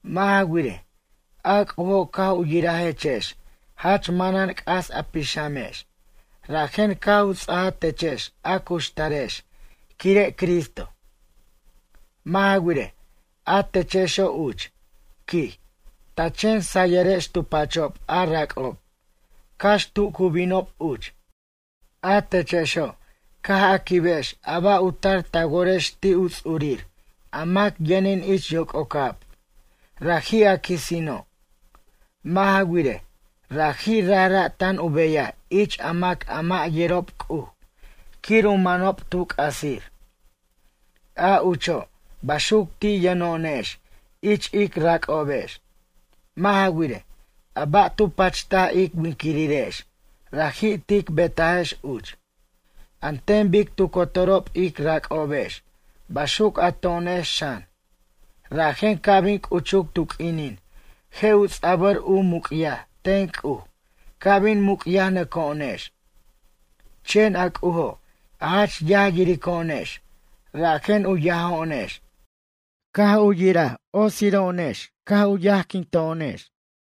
Mʌ' ja wirej, a C'ujo' caj u yirajechex jach manan c'as a pixamex, rajen caj u ts'aja techex a cuxtarex quire' Cristo. Mʌ' ja wirej, a techexo' uch, quij, ta chen sayʌrex tu pachob a rac'ob, cax tu cu binob uch. A techexo', caj a quibex a ba' u tar ta worex ti' u ts'urir a mac yʌnin ich yoc'ocab, raji' a quisino'. Mʌ' ja wirej, raji' rajra' tan u beyaj ich a mac a mʌ' yerob C'uj quir u manob tu c'asir. A ucho', baxuc ti' yʌno'onex ich ic rac'obex. Mʌ' ja wirej, a ba' tu pachtaj ic winquirirex raji' tic betajex uch. An ten bic tu cotorob ic rac'obex baxuc a to'onex xan, rajen ca' bin c'uchuc tu q'uinin je' u ts'a'bʌr u muc'yaj ten C'uj ca' bin muc'yajnʌco'onex. Chen a C'ujo' a jach yaj yirico'onex rajen u yajo'onex, caj u yirej otsiro'onex caj yajquinto'onex.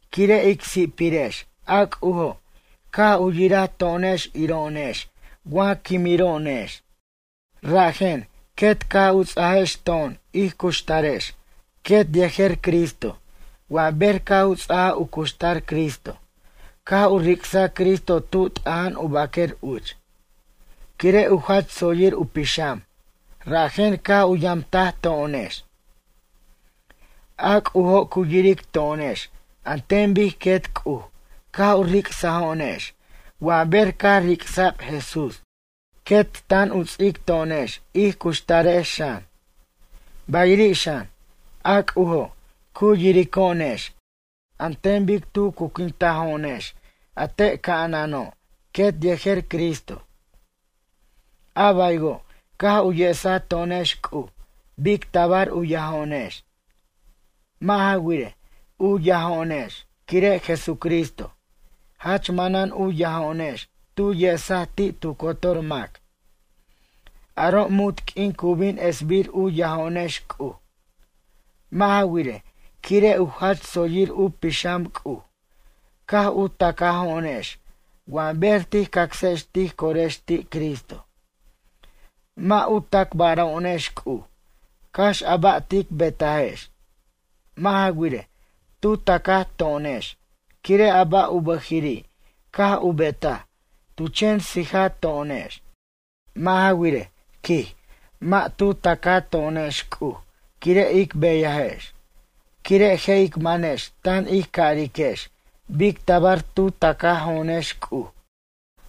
Quire' ic si'pirex, a C'ujo' caj u yiraj to'onex iro'onex wa quimiro'onex. Rajen, quet caj u ts'ajex to'on ij cuxtarex quet yejer Cristo wa ber caj u ts'aja u cuxtar Cristo caj u ric'saj Cristo tu t'aja'an u baquer uch. Quire' u jach tsoyir u pixam rajen caj u yamtaj to'onex. A C'ujo' cu yiric to'onex an ten bic quet C'uj caj u ric'sajo'onex wa ber caj ric'sa'b Jesús, quet tan u ts'ic to'onex ij cuxtarex xan. Bayiri' xan, a C'ujo' cu yirico'onex an ten bic tu cuquintajo'onex a te' ca'anano' quet yejer Cristo. A baywo' caj u yesaj to'onex C'uj bic tabar u yajo'onex. Mʌ' ja wirej, u yajo'onex quire' Jesucristo. Jach manan u yajo'onex tu yesaj ti' tu cotor mac. Aro' munt q'uin cu bin esbir u yajo'onex C'uj. Mʌ' ja wirej, quire' u jach tsoyir u pixam C'uj, caj u tacajo'onex wa ber tij cacsex tij corex ti' Cristo. Mʌ' u tacbaro'onex C'uj cax a ba' tic betajex. Mʌ' ja wirej, tu tacaj to'onex quire' a ba' u bʌjiri' caj u betaj, tu chen sija to'onex. Mʌ' ja wirej, quij, mʌ' tu tacato'onex C'uj quire' ic beyajex, quire' je' ic manex tan ij cariquex bic tabar tu tacajo'onex C'uj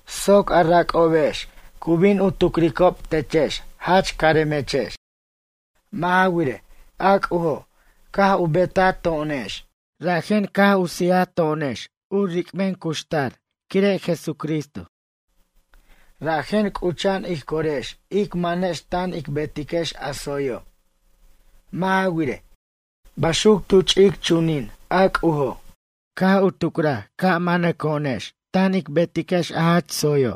soc a rac'obex cu bin u tucricob techex jach caremechex. Mʌ' ja wirej, a C'ujo' caj u betato'onex, rajen caj u sijto'onex u ric'ben cuxtar quire' Jesucristo. Rajen, c'ucha'an ij corex ic manex tan ic betiquex a tsoyo'. Mʌ' ja wirej, baxuc tu ch'ic chunin a C'ujo' caj u tucraj ca' manaco'onex tan ic betiquex a jach tsoy.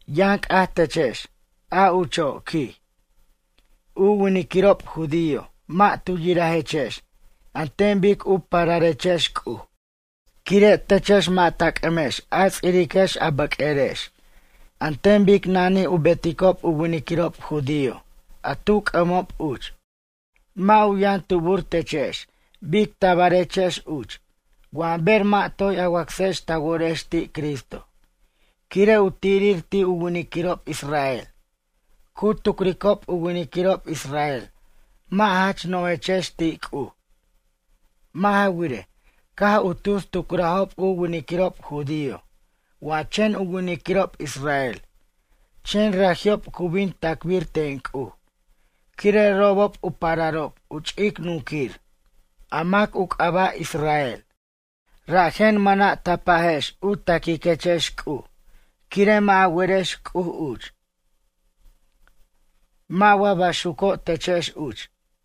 Yʌn c'aj techex, a ucho', quij, u winiquirob judío mʌ' tu yirajechex an ten bic u pararechex C'uj, quire' techex mʌ' ta c'ʌmex a ts'iriquex a bʌq'uerex an ten bic nanij u beticob u winiquirob judío a tu c'ʌmob uch. Mʌ' u yʌn tubur techex bic tabarechex uch, wa ber mʌ' toy a wacsex ta worex ti' Cristo. Quire' u tirir ti' u winiquirob israel, cu tucricob u winiquirob israel mʌ' jach nojechex ti' C'uj. Mʌ' ja wirej, caj u tus tucrajob u winiquirob judío wa chen u winiquirob israel chen raji'ob cu bin tacbir ten C'uj quire' robob u pararob u ch'ic nunquir, a mac u c'aba' Israel. Rajen mʌna' ta pajex u taquiquechex C'uj quire' mʌ' a werex C'uj uch. Mʌ' wa baxuco' techex uch?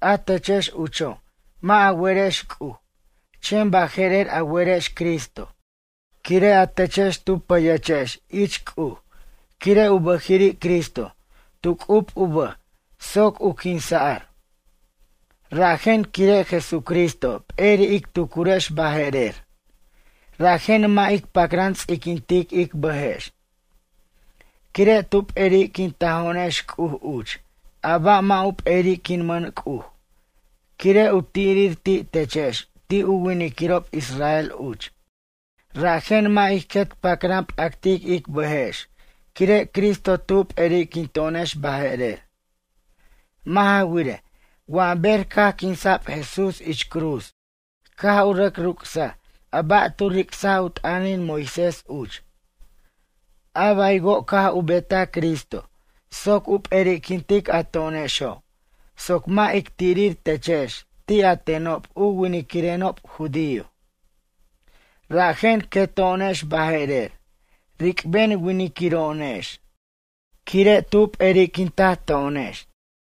A techex ucho' mʌ' a werex C'uj, chen baje'rer a werex Cristo quire' a techex tu pʌyechex ich C'uj quire' u bʌjiri' Cristo tu c'ub u bʌj soc u quinsa'r. Rajen quire' Jesucristo p'eri' ic tucurex baje'rer, rajen mʌ' ic pacran ts'iquintic ic bʌjex. Quire' tu p'eri'quintajo'onex C'uj uch a ba' mʌ' u peri'quinmʌn C'uj, quire' u tirir ti' techex ti' u winiquirob israel uch. Rajen mʌ' ij quet pacran p'actic ic bʌjex quire' Cristo tu p'eriquinto'onex baje'rer. Mʌ' ja wirej, wa ber caj quinsa'b Jesús ich cruz caj u rʌc rucsaj a ba' tu ricsaj u t'ʌnin Moisés uch. A baywo' caj u betaj Cristo soc u p'eri'quintic a to'onexo' soc mʌ' ic tirir techex ti' a tenob u winiquirenob judío. Rajen queto'onex baje'rer, ric'ben winiquiro'onex quire' tu p'eriquintaj to'onex.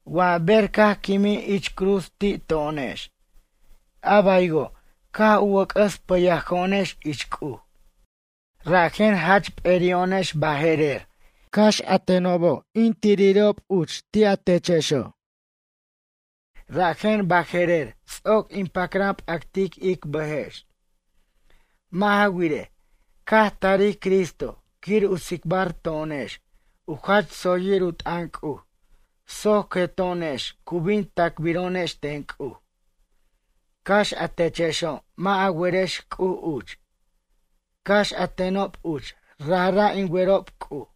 Wa ber caj quimij ich cruz ti' to'onex. A baywo' caj u wʌc'ʌs pʌyajo'onex ich C'uj. Rajen jach p'eri'o'onex baje'rer, cax a tenob in tiriro' tenob uch ti' a techexo' uch. Rajen baje'rer ts'oc ic pacran p'actic ic bʌjex. Mʌ' ja wirej, caj tarij Cristo quir u tsicbar to'onex u jach tsoyir u t'ʌn C'uj soc queto'onex cu bin tacbiro'onex ten C'uj. Cax a techexo' mʌ' a werex C'uj uch, cax a tenob uch rajra' in werob C'uj.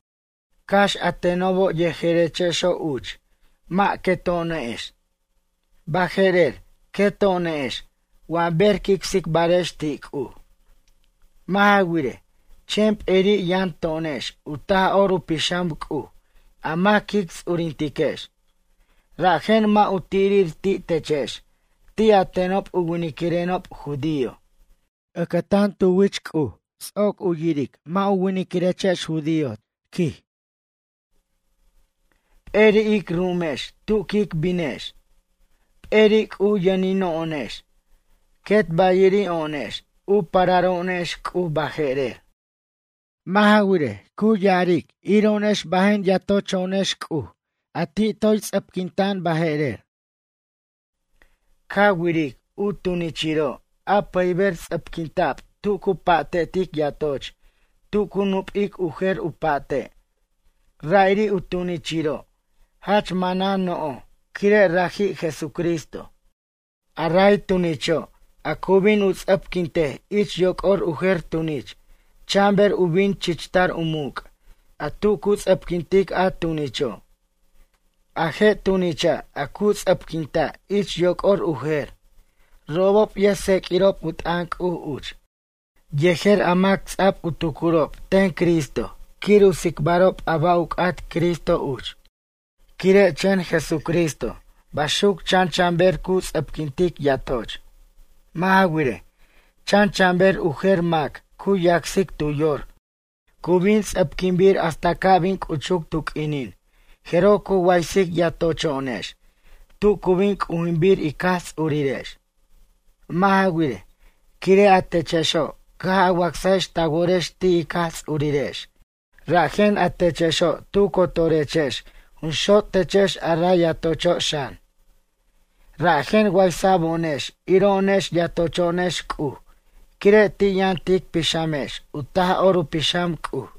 Cax a tenobo' yejerechexo' uch mʌ' queto'onex, baje'rer queto'onex wa ber quic tsicbarex ti' C'uj. Mʌ' ja wirej, chen p'eri' yʌn to'onex u Taj'or u Pixam C'uj a mac quic ts'urintiquex. Rajen mʌ' u tirir ti' techex ti' a tenob u winiquirenob judío. Ʌcʌtan tu wich C'uj ts'oc u yiric mʌ' u winiquirechex judío techex, quij. P'eri' ic ru'umex tu quic binex. P'eri' C'uj yʌnino'onex, quet bayiri'o'onex u pararo'onex C'uj baje'rer. Mʌ' ja wirej, cu ya'aric yiro'onex bajen yatocho'onex C'uj a ti' toy ts'ʌpquinta' baje'rer. Ca wiric u tunichiro' a pʌyber ts'ʌpquinta'b tu cu pa'tetic yatoch tu cu nupic u jer u pa'te', ra'iri' u tunichiro' jach manan no'j quire' raji' Jesucristo. A ray tunicho' a cu bin u ts'ʌpquintej ich yoc'or u jer tunich chan ber u bin chichtar u muc' a tu cu ts'ʌpquintic a tunicho'. A je' tunicha' a cu ts'ʌpquinta' ich yoc'or u jer, robob yʌjtseq'uirob u t'ʌn C'uj uch yejer a mac ts'a'b u tucurob ten Cristo quir u tsicbarob a ba' u c'at Cristo uch. Quire' chen Jesucristo baxuc chan chan ber cu ts'ʌpquintic yatoch. Mʌ' ja wirej, chan chan ber u jer mac cu yacsic tu yor cu bin ts'ʌpquinbir hasta ca' bin c'uchuc tu q'uinin jeroj cu waysic yatocho'onex tu cu bin c'ujinbir ic Jaj Ts'urirex. Mʌ' ja wirej, quire' a techexo' caj a wacsajex ta worex ti' ic Jaj Ts'urirex, rajen a techexo' tu cotorechex jun xot' techex a ray yatocho' xan. Rajen waysa'bo'onex iro'onex yatocho'onex C'uj quire' ti' yʌn tic pixamex u Taj'or u Pixam C'uj.